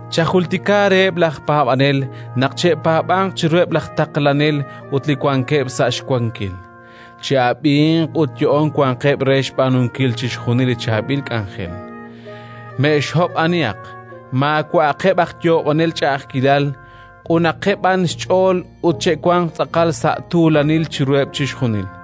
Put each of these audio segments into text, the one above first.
Chajultika reheb' laj paab'anel naq che'paab'anq chiruheb' laj taqlanel ut li wankeb' sa' xwankil; che'ab'inq ut yo'oon wanqeb' re xb'aanunkil chixjunil li chaab'il k'anjel. Me'xhob' anihaq, maawa'aqeb' aj yoob'anel ch'a'ajkilal, q'unaqeb' b'an xch'ool ut che'wanq tz'aqal sa' tuulanil chiruheb' chixjunil.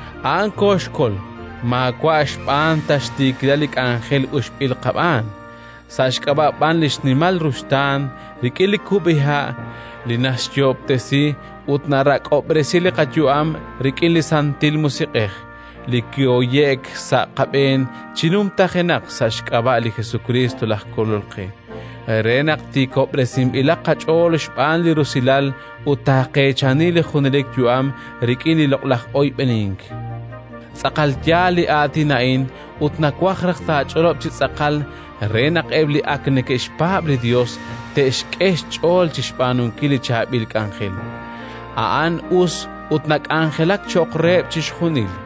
a'an kooxkol maawa' xb'aan ta xtiikilal li k'anjel uxb'il qab'aan, sa' xk'ab'a' b'an li xnimal ruxtaan, rik'in li kub'iha' li naxyoob'tesi ut narak'ob'resi li qayu'am, rik'in li Santil Musiq'ej li kihoye'k sa' qab'een chi numtajenaq sa' xk'ab'a' li Jesukriist laj Kolol qe, re naq tiikob'resinb'ilaq qach'ool xb'aan li rusilal ut taaqeechani li junelik yu'am rik'in li loq'laj oyb'enink. Tz'aqal yaal li aatin a'in ut nawaj naq taach'olob' chi tz'aqal, re naq eb' li ak neke'xpaab' li Yos te'xk'e xch'ool chi xb'aanunkil li chaab'il k'anjel. A'an us ut nak'anjelak cho'q reheb' chixjunil.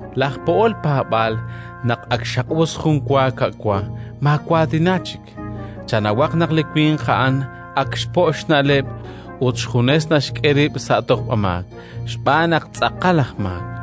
Laj po'ol paab'aal, naq ak xaq'us jun wa ka'wa, maawaatina chik: chanawaq naq li winq a'an ak xpo' xna'leb' ut xjunes naxk'e rib' sa' tojb'amaak, xb'aan naq tz'aqal aj maak.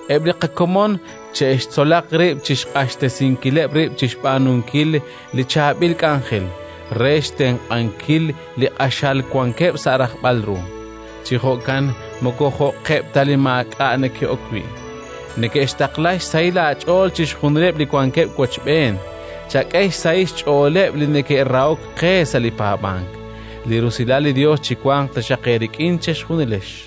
Eb' li qakomon che'xtzolaq rib' chi xq'axtesinkileb' rib' chi xb'aanunkil li chaab'il k'anjel re xtenq'ankil li q'axal wankeb' sa' rajb'al ru; chi jo'kan moko jo'qeb' ta li maak'a' neke'ok wi'. Neke'xtaqla xsahil aach'ool chixjunileb' li wankeb' wochb'een. Chak'e xsahil xch'ooleb' li neke'rahok qe sa' li paab'ank. Li rusilal li Yos chiwanq taxaq eerik'in chejunilex.